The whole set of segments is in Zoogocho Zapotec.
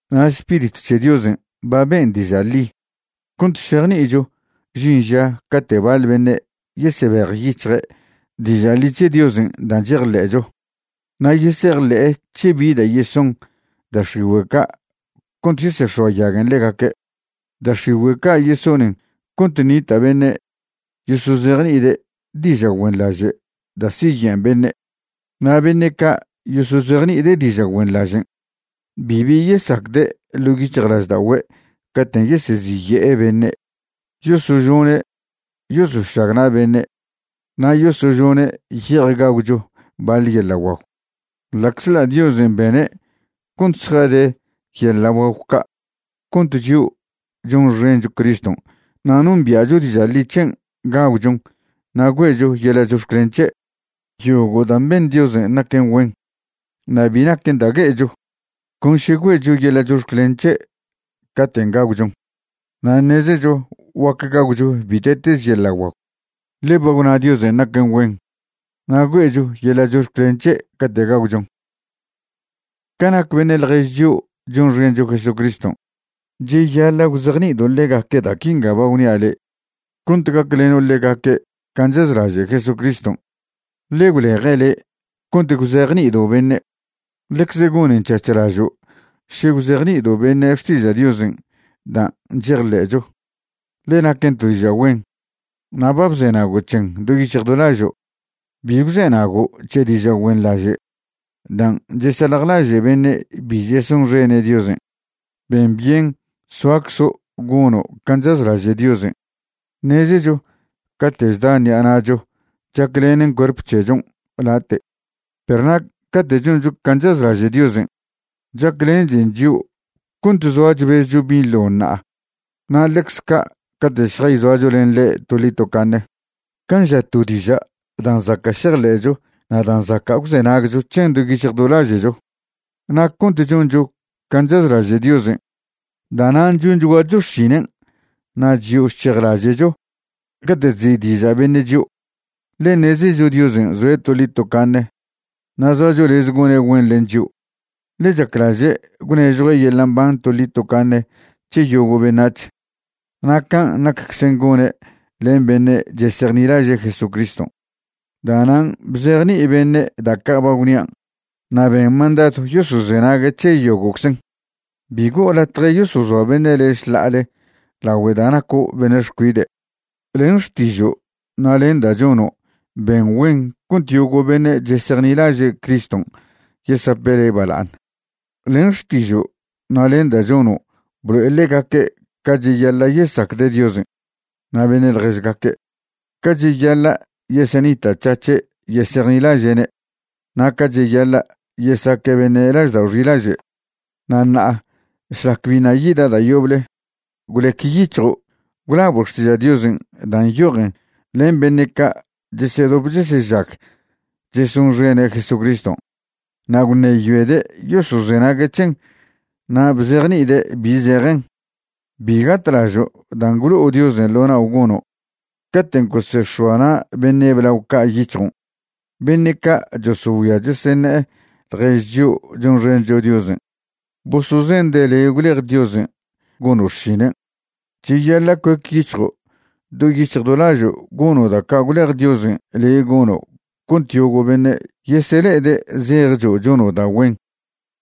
Na' Spiritw c̱he Diosen' ba ben' diža' ḻi cont šejni'icho žin ža cate' baḻ beṉe' yesebejyic̱hje' diža' ḻi c̱he Diosen' dan' chejḻe'cho na' yesejḻe'e c̱he bi da' yeson da' x̱igüe' ca' cont yesex̱oayaguen ḻegaque'. Da' x̱igüe' ca' yesonen cont ṉita' beṉe' yosozejni'ide' diža' güenḻaže' da' siyen' beṉe', na' beṉe' ca' yosozejni'ide' diža' güenḻažen' bibi yesacde' ḻo' yic̱hjlažda'ogüe' caten' yeseziye'e beṉe'. Yosožone' yosošagna' beṉe' na' yosožone' ye'ej gagwcho baḻ yeḻa' guagw, ḻa'czḻa' Diosen' bene' cont zjade yeḻa' guagw ca' cont chio' chonxencho Criston' na' nombia'cho diža' ḻi c̱hen' gagwchon na' güe'cho yeḻa' chox̱clen c̱he'. Yogo' dan' ben Diosen' naquen güen na' bi naquen da' gue'echo, con še güe'cho yeḻa' chox̱clen c̱he' caten' gagwchon. Na' ṉezecho guac gagwcho bite'teze yeḻa' guagw, ḻe ba gwna Diosen' naquen güen, na' güe'cho yeḻa' chox̱clen c̱he' cate' gagwchon. Ca nac beṉe' ḻjež chio' chonxencho Jesucriston', cheyaḻa' gwzejni'ido' ḻegaque' da' quinga ba gwnia' le' cont gacleno' ḻegaque' can' chazlaže' Jesucriston', ḻe gwleje' le' cont gwzejni'ido' beṉe'. Ḻecz gonen c̱hac̱hlažo' še gwzejni'ido' beṉe' xtiža' Diosen' dan' chejḻe'cho, ḻe naquen to diža' güen, na' ba bzenago' c̱hen do yic̱hj do lažo'. Bi gwzenago' c̱he diža' güenḻaže' dan' chesaljlaže' beṉe' bi chesonxene' Diosen'. Ben byen soaczo' gono' can' chazlaže' Diosen'. Ṉezecho cate' chda ṉi'a na'cho chaclenen cuerp c̱hechon' late'. Perw na' cate' choncho can' chazlaže' Diosen', chaclenchen chio' cont zoa chbezcho binḻo ṉa'a na' ḻecz ca' cate' šjayzoacho len ḻe' toḻi tocaṉe. Can' ža to diža' dan' zaca' šejḻe'cho na' dan' zaca' gwzenagcho c̱hen do yic̱hj do laže'cho. Na' cont choncho can' chazlaže' Diosen', da'nan' chonchguacho xšinen' na' chyo chc̱hejlaže'cho cate' chzi'diža' beṉe' chio', ḻe ṉezecho Diosen' zoe' toḻi tocaṉe na' zoacho lez gone' güen len chio'. Ḻe' chaclaže' gwnežjue' yeḻa' mban toḻi tocaṉe c̱he yogo' beṉac̱h, na' can' nacczen gone' len beṉe' chesejnilaže' Jesucriston'. Da'nan' bzejni'i beṉe' da' ca' ba gwnian' na' ben mandadw yosozenague' c̱he yogo'czen. Bi go'o latje yosozoa beṉe' le' šḻa'ale lagüe da' naco' beṉe' xcuide'. Len xtižo' na' len da' chono' ben güen cont yogo' beṉe' chesejnilaže' Criston' yesape' le' bala'aṉ. Len xtižo' na' len da' chono' blo'e ḻegaque' ca cheyaḻa' yesacde' Diosen' na' beṉe' ḻježgaque', ca cheyaḻa' yesenita'c̱hac̱he' yesejnilaže'ne' na' ca cheyaḻa' yesaque' beṉe' laždao' xilaže'. Na' ṉa'a šlac biṉa' yida' da' yoble, gwlec yic̱hjo' gwlabo' Xtiža' Diosen' dan' nyojen len beṉe' ca' chesedop chesežag chesonxene' Jesucriston'. Na' gwṉeyoede' yosozenague' c̱hen na' bzejni'ide' bi zejen. Bi gatlažo' dan' gwlo'o Diosen' ḻo nao' gono' caten' gosex̱oa na' beṉe' blao ca' yic̱hjon', beṉe' ca' chosogüia cheseṉe'e ḻjež chio' chonxencho Diosen', bosozende' le' gwlej Diosen' gono' xšinen'. Cheyaḻa' cuec yic̱hjo' do yic̱hj do lažo' gono' da' ca' gwlej Diosen' le' gono' cont yogo' beṉe' yesele'ede' zejcho' chono' da' güen.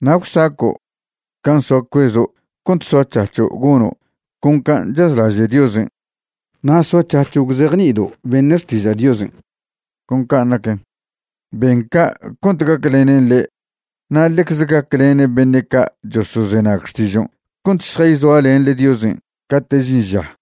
Na' gwsaco' can' soa cuezo' cont soac̱hac̱ho' gono' con can' chazlaže' Diosen' na' soac̱hac̱ho' gwzejni'ido' beṉe' xtiža' Diosen' con can' naquen. Ben ca' cont gaclenen le' na' ḻecze gaclenen beṉe' ca' chosozenag xtižon' cont šjayzoalenḻe Diosen' cate' žin ža.